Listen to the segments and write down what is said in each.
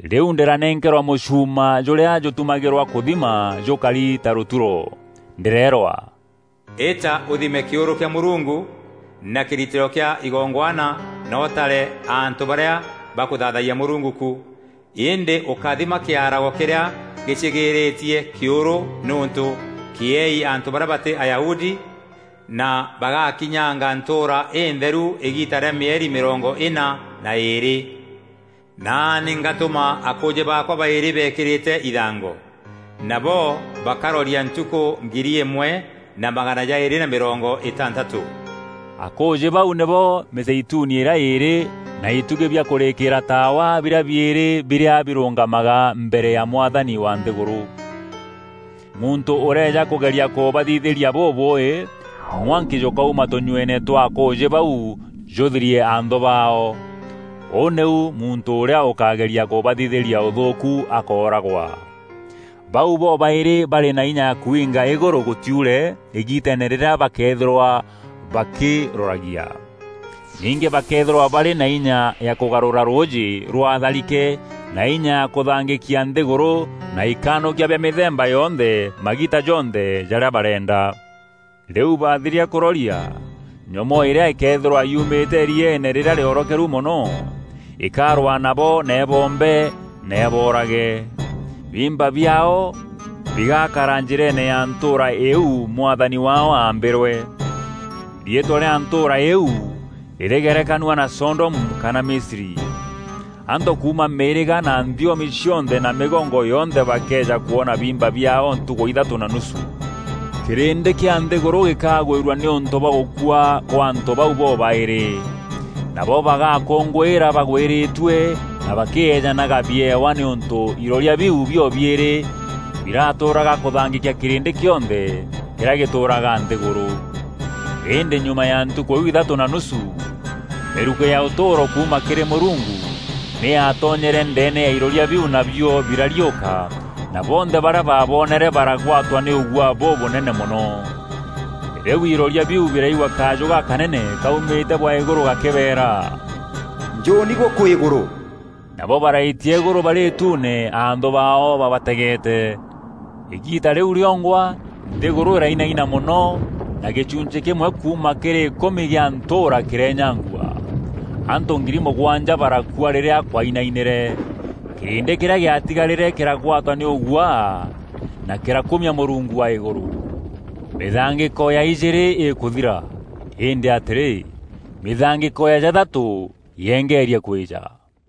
Rîu ndîranenkerwa mûchuuma jûrîa jûtumagîrwa kûthima jûkari ta rûturo. Ndîreerwa, “Îta ûthime kîûrû kîa Mûrungu na kîritîro kîa igongwana na ûtare antû barîa bakûthaathayia Mûrungu ku. Îndî ûkáthima kîarago kîrîa gîcîgîîrîîtie kîûrû nîûntû kîeei antû barîa batî Ayahudi na bagakinyanga ntûûra întheru îgiita rîa mîeri mîrongo îna na îîrî. Naani ngatûma akûûjî baakwa baîrî beekîrîte ithango. Nabo bakaroria ntukû ngiri îmwe na magana jaîrî na mîrongo îtantatû.” Akûûjî bau nîbo mîzeituni îrîa îîrî na itugî bîa kûrîkîîra taawa birîa biîrî birîa birûngamaga mbere ya Mwathani wa nthîgûrû. Muntû ûrëeja kûgeria kûbathithîria bûbûûî, mwanki jûkauma tûnyueene twa akûûjî bau jûthirie anthû baao. Ûu nîu muntû ûrîa ûkageria kûbathithîria ûthûûku akooragwa. Bau bobaîrî barî na inya ya kwiinga îgûrû gûtiure îgiiteene rîrîa bakeethîrwa bakîroragia. Ningî bakeethîrwa barî na inya ya kûgarûra rûûjî rwaa tharike na inya ya kûthangîkia nthîgûrû na ikanûkia bia mîthemba yonthe magiita jonthe jarîa bareenda. Rîu bathiria kûroria, nyomoo îrîa îkeethîrwa yumîte îrinyeene rîrîa rîorokeru mono, îkarwaa nabo na îboombe na îboorage. Biimba biaao bigakara njîreene ya ntûûra iu Mwathani waao aambîrwe. Riîtwa rîa ntûûra îîu rîrîgerekanua na Sodomu kana Misri. Antû kuuma mîîrîga na nthiomi cionthe na mîgongo yonthe bakeeja kwoona biimba biaao ntukû ithatû na nusu. Kîrîndî kîa nthîgûrû gîkagwîrua nîûntû bwa gûkua kwa antû bau bobaîrî. Nabo bagakûngûîra bagwîrîtue na bakîeejanaga biewa nîûntû iroria biu bio-biîrî biratûûraga kûthangîkia kîrîndî kîonthe kîrîa gîtûûraga nthîgûrû. Îndî nyuma ya ntukû iu ithatû na nusu, mîrukî ya ûtûûro kuuma kîrî Mûrungu nî yaatonyere ndeene ya iroria biu nabio birariûka na bonthe barîa baabonere baragwatwa nî ûguaa bûbûnene mono. Rîu iroria biu biraigua kajû gakanene kaumîte bwa îgûrû gakîbeera, “Njûûni gûkû îgûrû!” Nabo baraitia îgûrû barî îtuune anthû baao babategeete. Îgiita rîu rîongwa nthîgûrû îrainaina mono, na gîchunchî kîmwe kuuma kîrî îkûmi gîa ntûûra kîrenyangua. Antû ngiri mûgwanja barakua rîrîa kwainainîre. Kîrîndî kîrîa gîatigarîre kîragwatwa nî ûguaa na kîrakumia Mûrungu wa Îgûrû. Mîthangîko ya ijîîrî îkûthira, îndî atîrî, mîthangîko ya jathatû yeengerie kwîîja.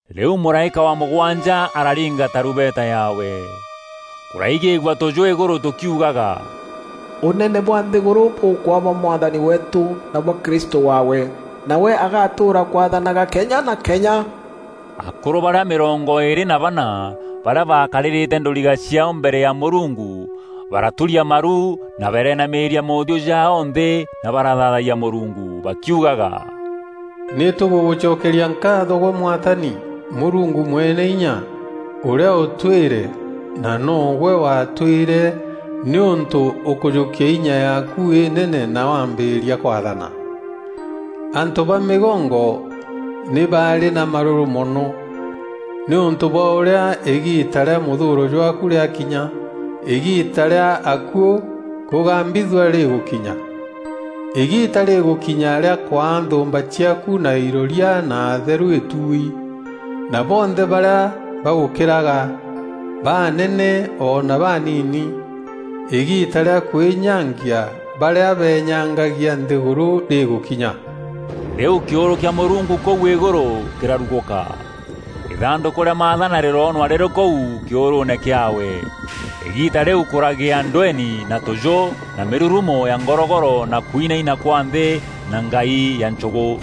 Rîu mûraîka wa mûgwanja araringa tarumbeta yaawe. Kûraigîîgua tûjû îgûrû tûkiugaga, “Ûnene bwa nthîgûrû bûkwaa bwa Mwathani weetû na bwa Kristû waawe. Nawe agatûûra kwaathanaga kenya na kenya!” Akûrû barîa mîrongo îîrî na bana barîa bakarîrîte ndûriga ciaao mbere ya Mûrungu baraturia maru na barenamîîria moothiû jaao nthî na barathaathayia Mûrungu, bakiugaga, “Nî tûgûgûcokeria nkaatho gwe Mwathani Mûrungu Mweneinya, ûrîa ûtwîre na no gwe watwîre nîûntû ûkujûkia inya yaaku înene na wambîrîria kwaathana. Antû ba mîgongo nî baarî na marûrû mono, nîûntû bwa ûrîa îgiita rîa mûthûûro jwaaku rîakinya, îgiita rîa akuû kûgambithua rîgûkinya. Îgiita rîgûkinya rîa kwaa nthûûmba ciaaku na iroria na atheru îtui, na bonthe barîa bagûkîraga; baanene o na baanini. Îgiita rîa kwînyangia barîa beenyangagia nthîgûrû rîgûkinya!” Rîu kîûrû kîa Mûrungu kûu îgûrû kîrarugûka. Îthandûkû rîa Maathana rîroonwa rîrî kûu kîûrûûne kîaawe. Îgiita rîu kûragîa ndweeni na tûjû na mîrurumo ya ngorogoro na kwinaina kwa nthî na ngai ya nchûgû.